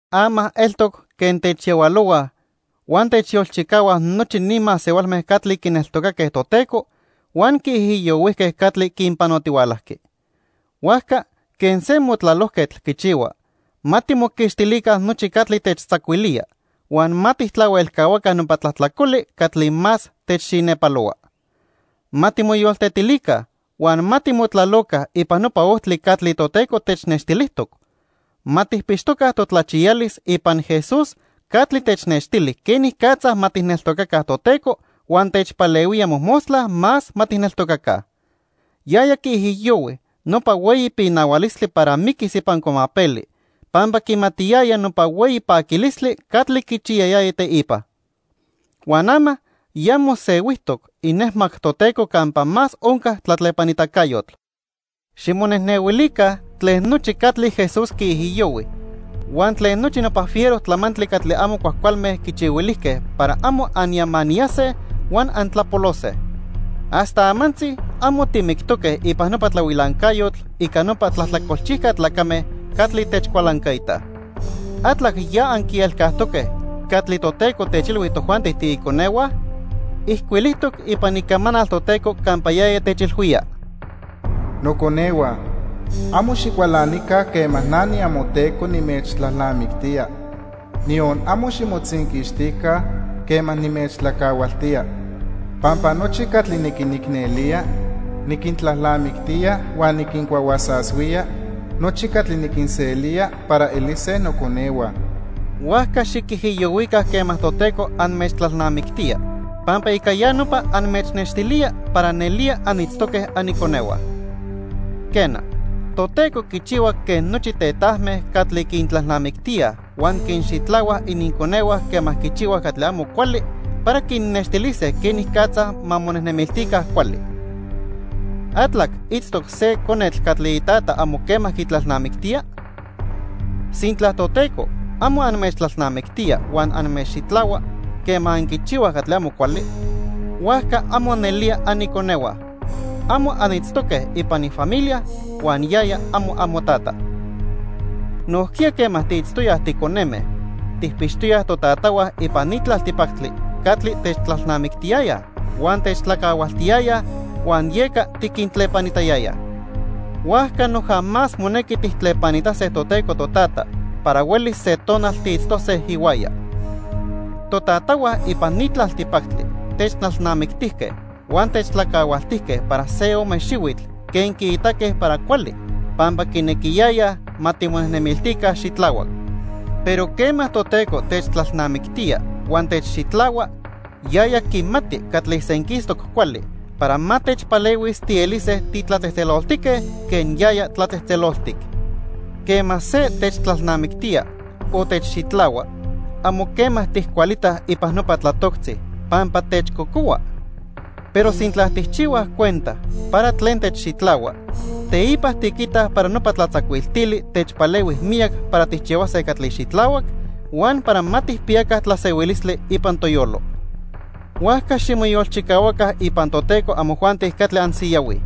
Ama eltoc quen techyahualohuaj huan techyolchicahuaj nochi ni masehualme catli quineltocaque Toteco huan quiijiyohuijque catli quinpanotihualajqui. Huajca quen se motlalojquetl quichihua, ma timoquixtilica nochi catli techtzacuilía huan ma tijtlahuelcahuaca nopa tlajtlacoli catli más techxinepalohua. Ma timoyoltetilica huan ma timotlaloca ipan nopa ojtli catli Toteco technextilijtoc. Ma tijpixtoca totlachiyalis ipan Jesús catli technextili quenicatza ma tijneltocaca Toteco huan techpalehuía mojmostla más ma tijneltocaca. Yaya quiijiyohui nopa hueyi pinahualistli para miquis ipan cuamapeli pampa quimatiyaya nopa hueyi paquilistli catli quichiyayaya teipa. Huan ama ya mosehuijtoc inejmac Toteco campa más onca tlatlepanitacayotl. Ximonejnehuilica tlen nochi catli Jesús quiijiyohui huan tlen nochi nopa fiero tlamantli catli amo cuajcualme quichihuilijque para amo anyamaniyase huan antlapolose. Hasta amantzi amo timictoque ipan nopa tlahuilancayotl ica nopa tlajtlacolchijca tlacame catli techcualancaitaj. ¿Atlac ya anquielcajtoque catli Toteco techilhui tojuanti tiiconehua? Ijcuilijtoc ipan Icamanal Toteco campa yaya techilhuía: "Noconehua, amo xicualanica quema na niamoTeco nimechtlalnamictía, niyon amo ximotzinquixtica quema nimechtlacahualtía. Pampa nochi catli niquinicnelía, niquintlalnamictía, huan niquincuahuasashuía nochi catli niquinselía para elise noconehua." Huajca xiquijiyohuica quema Toteco anmechtlalnamictía pampa ica ya nopa anmechnextilía para nelía anitztoque aniconehua. Quena, Toteco quichihua quen nochi tetajme catli quintlalnamictíaj huan quinxitlahuaj ininconehua quema quichihuaj catli amo cuali para quinnextilise quenicatza ma monejnemiltica cuali. ¿Atlac itztoc se conetl catli itata amo quema quitlalnamictía? Sintla Toteco amo anmechtlalnamictía huan anmechxitlahua quema anquichihuaj catli amo cuali, huajca amo nelía aniconehua. Amo anitztoque ipan ifamilia huan yaya amo amoTata. Nojquiya quema tiitztoyaj ticoneme, tijpixtoyaj totatahua ipan ni tlaltipactli catli techtlalnamictiyayaj huan techtlacahualtiyayaj huan yeca tiquintlepanitayayaj. Huajca noja más monequi tijtlepanitase Toteco Totata para huelis se tonal tiitztose ihuaya. Totatahua ipan ni tlaltipactli techtlalnamictijque huan techtlacahualtijque para se ome xihuitl quen quiitaque para cuali pampa quinequiyayaj ma timonejnemiltica xitlahuac. Pero quema Toteco techtlalnamictía huan techxitlahua, yaya quimati catli senquistoc cuali para ma techpalehuis tielise titlatzejtzeloltique quen yaya tlatzejtzeloltic. Quema se techtlalnamictía o techxitlahua, amo quema tijcualitaj ipan nopa tlatoctzi, pampa techcocohua. Pero sintla tijchihuaj cuenta para tlen techxitlahua, teipa tiquitaj para nopa tlatzacuiltili techpalehui miyac para tijchihuase catli xitlahuac huan para ma tijpiyaca tlasehuilistli ipan toyolo. Huajca ximoyolchicahuaca ipan Toteco amojuanti catli ansiyahuij.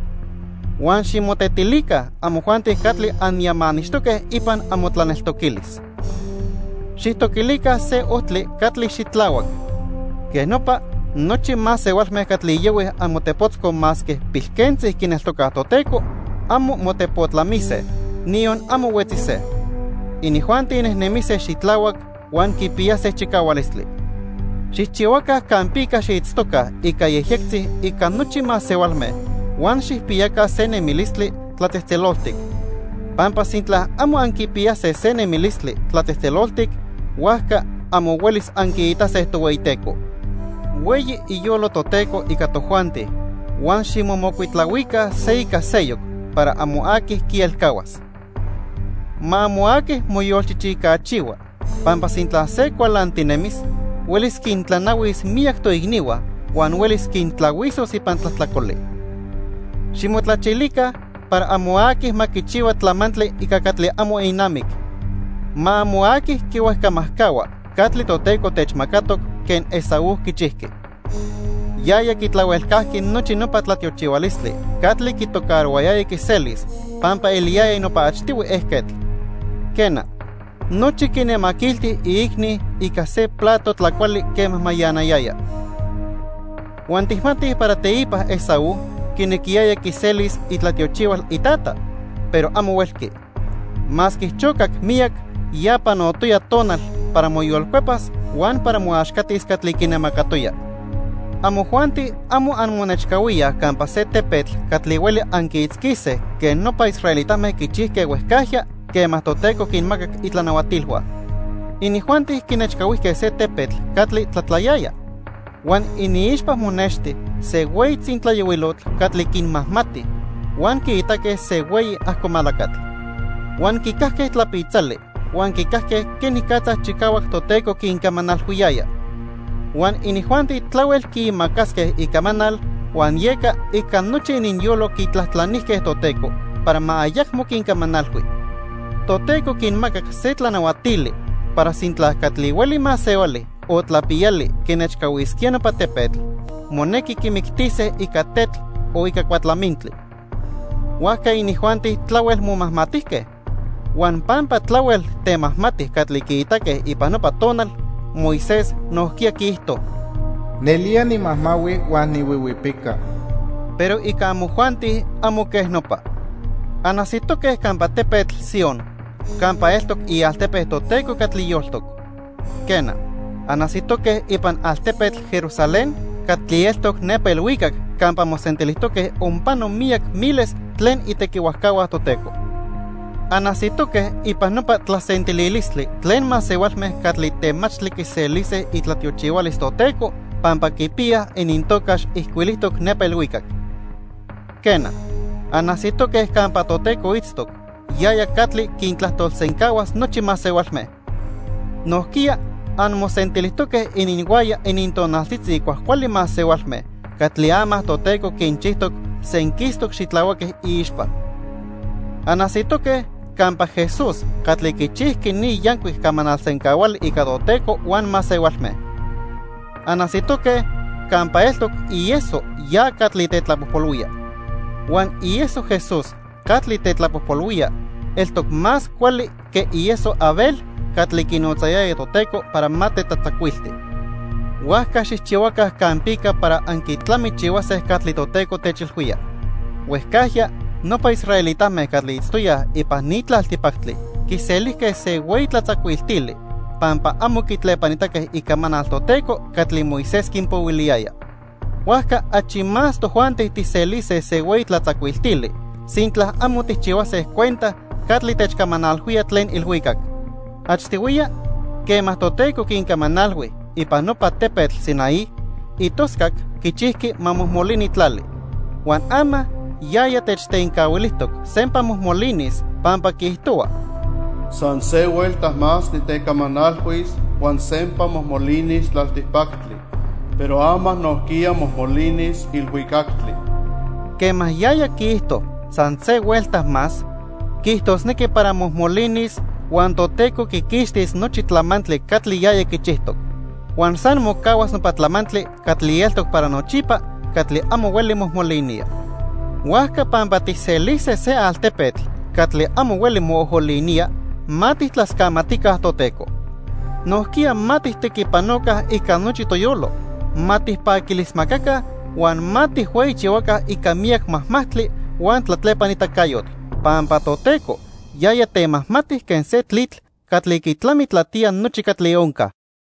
Huan ximotetilica amojuanti catli anyamanixtoque ipan amotlaneltoquilis. Xijtoquilica se ojtli catli xitlahuac. Quej nopa, nochi masehualme catli yohuij amotepotzco masque pilquentzi quineltocaj Toteco, amo motepotlamise, niyon amo huetzise. Inijuanti nejnemise xitlahuac huan quipiyase chicahualistli. Xijchihuaca campica xiitztoca ica yejyectzi ica nochi masehualme huan xijpiyaca se nemilistli tlatzejtzeloltic, pampa sintla amo anquipiyase se nemilistli tlatzejtzeloltic, huajca amo huelis anquiitase Tohueyiteco. Hueyi iyolo Toteco ica tojuanti huan ximomocuitlahuica se ica seyoc para amo aqui quielcahuas. Ma amo aqui moyolchichicachihua, pampa sintla se cualantinemis, huelis quintlanahuis miyac toicnihua huan huelis quintlahuisos ipan tlajtlacoli. Ximotlachilica para amo aqui ma quichihua tlamantli ica catli amo inamic. Ma amo aqui quihuejcamajcahua catli Toteco techmacatoc quen Esaú quichijqui. Yaya quitlahuelcajqui nochi nopa tlatiochihualistli catli quitocarohuayaya quiselis pampa eliyaya nopa achtihui ejquetl. Quena, nochi quinemaquilti iicni ica se plato tlacuali quema mayanayaya. Huan tijmatij para teipa Esaú quinequiyaya quiselis itlatiochihual itata, pero amo huelqui. Masque chocac miyac, ya panotoya tonal para moyolcuepas huan para moaxcatis catli quinemacatoya. Amojuanti amo anmonechcahuíaj campa se tepetl catli hueli anquiitzquise quen nopa israelitame quichijque huejcajya quema Toteco quinmacac itlanahuatilhua. Inijuanti quinechcahuijque se tepetl catli tlatlayaya, huan iniixpa monexti se hueyi tzintlayohuilotl catli quinmajmati, huan quiitaque se hueyi ajcomalacatl. Huan quicajque tlapitzali huan quicajque quenicatza chicahuac Toteco quincamanalhuiyaya. Huan inijuanti tlahuel quiimacasque icamanal huan yeca ica nochi ininyolo quitlajtlanijque Toteco para ma ayacmo quincamanalhui. Toteco quinmacac se tlanahuatili para sintla catli hueli masehuali o tlapiyali quinechcahuisquía nopa tepetl, monequi quimictise ica tetl o ica cuatlamintli. Huajca inijuanti tlahuel momajmatijque. Huan pampa tlahuel temajmati catli quiitaque ipan nopa tonal, Moisés nojquiya quiijto: "Nelía nimajmahui huan nihuihuipica." Pero ica amojuanti amo quej nopa. Anajsitoque campa tepetl Sion campa eltoc ialtepe Toteco catli yoltoc. Quena, anajsitoque ipan altepetl Jerusalén catli eltoc nepa ilhuicac campa mosentilijtoque onpano miyac miles tlen itequihuajcahua Toteco. Anajsitoque ipan nopa tlasentililistli tlen masehualme catli temachtli quiselise itlatiochihualis Toteco pampa quipiyaj inintocax ijcuilijtoc nepa ilhuicac. Quena, anajsitoque campa Toteco itztoc, yaya catli quintlajtolsencahuas nochi masehualme. Nojquiya anmosentilijtoque ininhuaya inintonaltzitzi cuajcuali masehualme catli ama Toteco quinchijtoc senquistoc xitlahuaque iixpa. Anajsitoque campa Jesús catli quichijqui ni yancuic camanal sencahuali ica Toteco huan masehualme. Anajsitoque campa eltoc ieso ya catli tetlapojpolhuía. Huan ieso Jesús catli tetlapojpolhuía eltoc más cuali que ieso Abel catli quinotzayaya Toteco para ma tetlatzacuilti. Huajca xijchihuaca campica para anquitlamichihuase catli Toteco techilhuía. Huejcajya nopa israelitame catli itztoyaj ipan ni tlaltipactli quiselijque se hueyi tlatzacuiltili pampa amo quitlepanitaque icamanal Toteco catli Moisés quinpohuiliyaya. Huajca achi más tojuanti tijselise se hueyi tlatzacuiltili sintla amo tijchihuase cuenta catli techcamanalhuía tlen ilhuicac. Achtihuiya, quema Toteco quincamanalhui ipan nopa tepetl Sinaí, itoscac quichijqui ma mojmolini tlali. Huan ama yaya techtencahuilijtoc sempa mojmolinis pampa quiijtohua: "San se huelta más nitecamanalhuis, huan sempa mojmolinis tlaltipactli. Pero ama nojquiya mojmolinis ilhuicactli." Quema yaya quiijto: "San se huelta más", quiijtosnequi para mojmolinis huan Toteco quiquixtis nochi tlamantli catli yaya quichijtoc. Huan san mocahuas nopa tlamantli catli eltoc para nochipa catli amo hueli mojmolinía. Huajca pampa tijselise se altepetl catli amo hueli moojolinía, ma tijtlascamatica Toteco. Nojquiya ma tijtequipanoca ica nochi toyolo, ma tijpaquilismacaca huan ma tijhueyichihuaca ica miyac majmajtli huan tlatlepanitacayotl, pampa Toteco yaya temajmati quen se tlitl catli quitlamitlatía nochi catli onca.